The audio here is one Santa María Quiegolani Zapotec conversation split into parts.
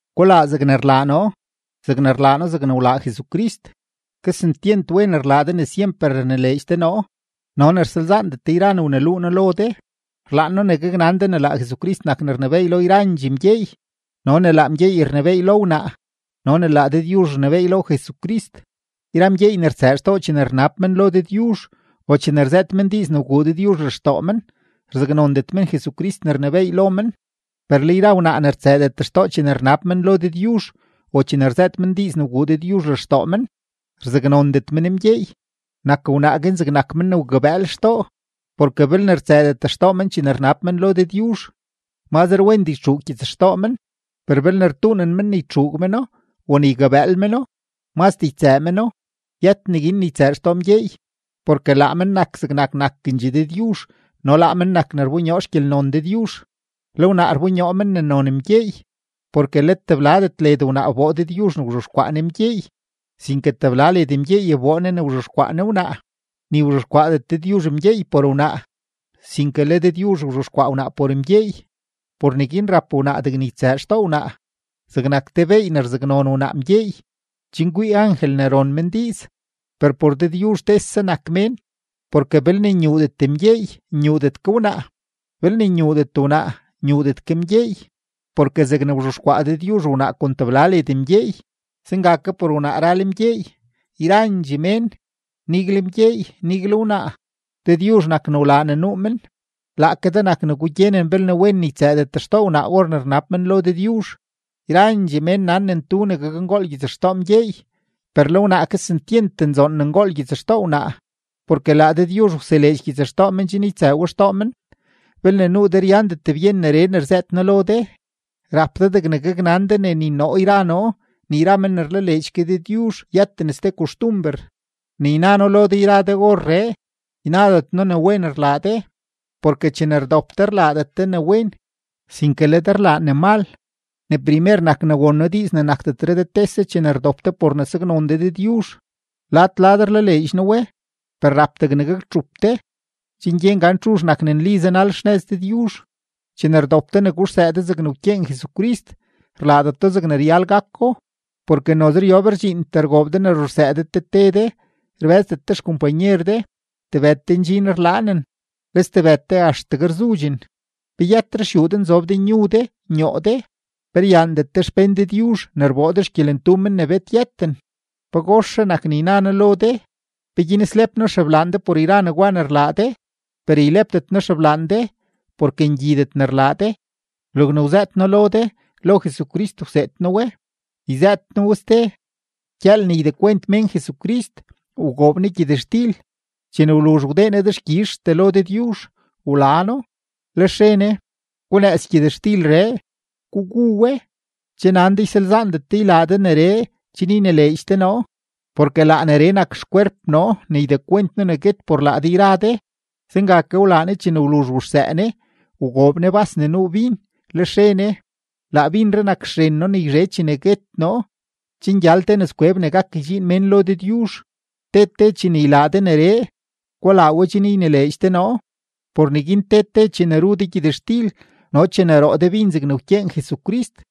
Gulaa zegne rlaa noo, zegne rlaa noo zegne wlaa Jesucrist. Kesentyent wen rlaa de ne syemper rnileedx de noo no ne rsalzaandet de yra ne wneluu noo lo de. Rlaan noo ne gaknan de ne laa Jesucrist nak ne rnebééy lo yrandxee mgyeey no ne laa mgyeey rnebééy lo wnaa no ne laa Dëdyuzh rnebééy lo Jesucrist. Yra mgyeey ne rtsëë xtoo chene rnab men lo Dëdyuzh o chene rzëët men diiz ne wguu Dëdyuzh lextoo men, rzaknondet men Jesucrist ne rnebééy lo men. Per le yra wnaa ne rtsëëdet xtoo chene rnab men lo Dëdyuzh o chene rzëët men diiz ne wguu Dëdyuzh lextoo men, rzaknondet men mgyeey; nak wnaa guin zegnak men ne wgabëël xtoo. Porke belne rtsëëdet xtoo wnaa chene rnab men lo Dëdyuzh, mazre wendee ytxuug gyitsxtoo men; per belne rtuunen men ne ytxuug meno o ne ygabëël meno, mazdee ytsëë meno. Yët neguin ne ytsëë xtoo mgyeey, porke laa men nak zegnak nakendxee Dëdyuzh no laa men nak ne rbonyoo xgyelnon Dëdyuzh, le wnaa rbonyoo men ne non mgyeey. Porke let tebladet led wnaa wboo Dëdyuzh ne wzhexkwaa Ne mgyeey, sinke tebla led mgyeey wboo Ne ne wzhexkwaa Ne wnaa. Ni wzhexkwaadet Dëdyuzh mgyeey por wnaa, sinke le Dëdyuzh wzhexkwaa wnaa por mgyeey. Por neguin rap wnaa degne ytsëë xtoo wnaa zegnak te beey ne rzaknon wnaa mgyeey, chen kwii angel ne ron men diiz. Per por Dëdyuzh tese nak mén, porke belne nyuudet mgyeey, nyuudet ke wnaa; belne nyuudet wnaa, nyuudet ke mgyeey. Porke zegne wzhexkwaa Dëdyuzh wnaa kon tebla led mgyeey, zenga ke por wnaa ral mgyeey; yrandxee mén, nigle mgyeey, nigle wnaa, Dëdyuzh nak ne wlaa ne nuu men. Laake de nak ne gugyenen belne wen ne ytsëëdet xtoo wnaa or ne rnab men lo Dëdyuzh. Yrandxee mén nan ne ntu ne gakngool gyitsxtoo mgyeey; per le wnaa, kesentyent nzoon ne ngool gyitsxtoo wnaa, porke laa Dëdyuzh wseleedx gyitsxtoo men chen ytsëë we xtoo men. Belne nuu de ryandet byen neree ne rzëët noo lo de, rap de degne gaknan de ne ni noo yra noo ni yra men ne rlaleedx ke Dëdyuzh yëten ste koxtumber. Ne yna noo lo de yra de orree, ynadet noo ne wen rlaa de, porke chene rdop de, rlaadet de ne wen, sinke le de rlaa ne mal. Ne primer nak ne won noo diiz ne nakdetre de tese chene rdop de por ne saknon de Dëdyuzh; lad lad rlaleedx noo we. Per rap degne gaktxup de, chen gyen gan txuzh nak ne nli zanal xnëz Dëdyuzh. Chene rdop de ne guxsëë de zegne wkyeen Jesucrist, rlaadet do zegne ryal gako. Porke noze ryob rdxiintee rgoob de ne ruxsëë de te te de, rbë́zdet de xkompanyer de; tebëd de ndxin rlaanen, le stebëd de axtegue rzudxen. ¿Pe yët ruxyuu de nzob de nyu de, nyoo de? ¿Pe ryaandet de xpén Dëdyuzh ne rboo de xgyelentu men ne bet yëten? ¿Pagoxre nak ne yna noo lo de? ¿Peguin slep noo xeblaan de por yra negwa ne rlaa de? Per ylepdet noo xeblaan de porke ngyidet ne rlaa de. Logne wzëët noo lo de, lo Jesucrist wseed noo we. Yzëët noo we ste: Gyëël ne ydekwent mén Jesucrist, wgoob Ne gyëtxtil, chene wluzh wdee Ne dexkyizhtee lo Dëdyuzh, wla No, lex re Ne: “Gunëëz gyëtxtilree, gugu we. Che nan de ysalzaandet de ylaa de neree chen ynileedx de noo, porke laa neree nak xkwerp noo ne ydekwent noo ne guet por laa de yra de.” Zenga ke wlaa Ne chene wluzh wuxsëë Ne, wgoob Ne bas ne nuu bin, lex re Ne: “Laa binree nak xren noo ne yzhe chene guet noo chen gyal te nëzkweb ne gak ydxiin mén lo Dëdyuzh. Te te chene ylaa de neree, gulaa we chen ynileedx de noo.” Por neguin te te chene ru de gyëtxtil no chene roo de bin zegne wkyeen Jesucrist,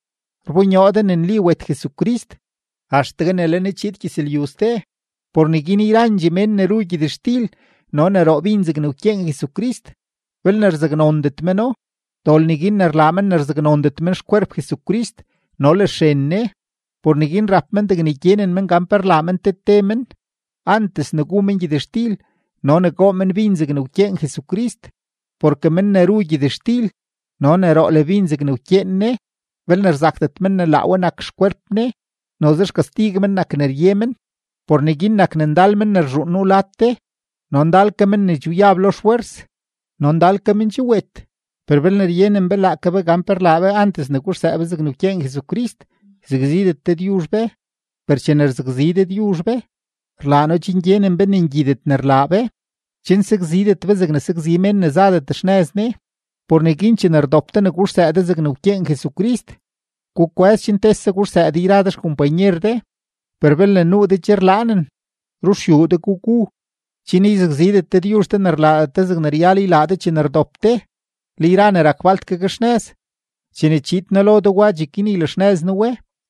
rbonyoo de ne nli wet Jesucrist, axtegue ne le Ne chiid gyëzlyu ste. Por neguin yrandxee mén ne ru gyëtxtil no ne roo bin zegne wkyeen Jesucrist, belne rzaknondet meno, dol neguin ne rlaa men ne rzaknondet men xkwerp Jesucrist no le xren Ne. Por neguin rap men degne gyenen men gan pe rlaa men te te men antes ne gu men gyëtxtil no ne goo men bin zegne wkyeen Jesucrist. Porke men ne ru gyëtxtil no ne roo le bin zegne wkyeen Ne, belne rzakdet men ne laa we nak xkwerp Ne, noze xkastig men nak ne rye men. Por neguin nak ne ndal men ne rzhuun nuu lad de, no ndal ke men ne che wyab lo xfwers, no ndal ke men che wet. Per belne ryenen be laake be gan pe rlaa be antes ne guxsëë be zegne wkyeen Jesucrist, yzakzidet Dëdyuzh be. Per chene rzakzi Dëdyuzh be, rlaa No chen gyenen be ne ngyidet ne rlaa be, chen sakzidet be zegne sakzi mén ne zadet xnëz Ne. Por neguin chene rdop de ne guxsëë de zegne wkyeen Jesucrist, gukwë́z chen tese guxsëë de yra de xkompanyer de. Per belne nuu de che rlaanen, ruxyuu de gugu, chen yzakzidet Dëdyuzh de ne rlaadet de zegne ryal ylaa de chene rdop de. Le yra ne rak falt gakxnëz, chene chiid noo lo de wa, cheguin ylaxnëz noo we.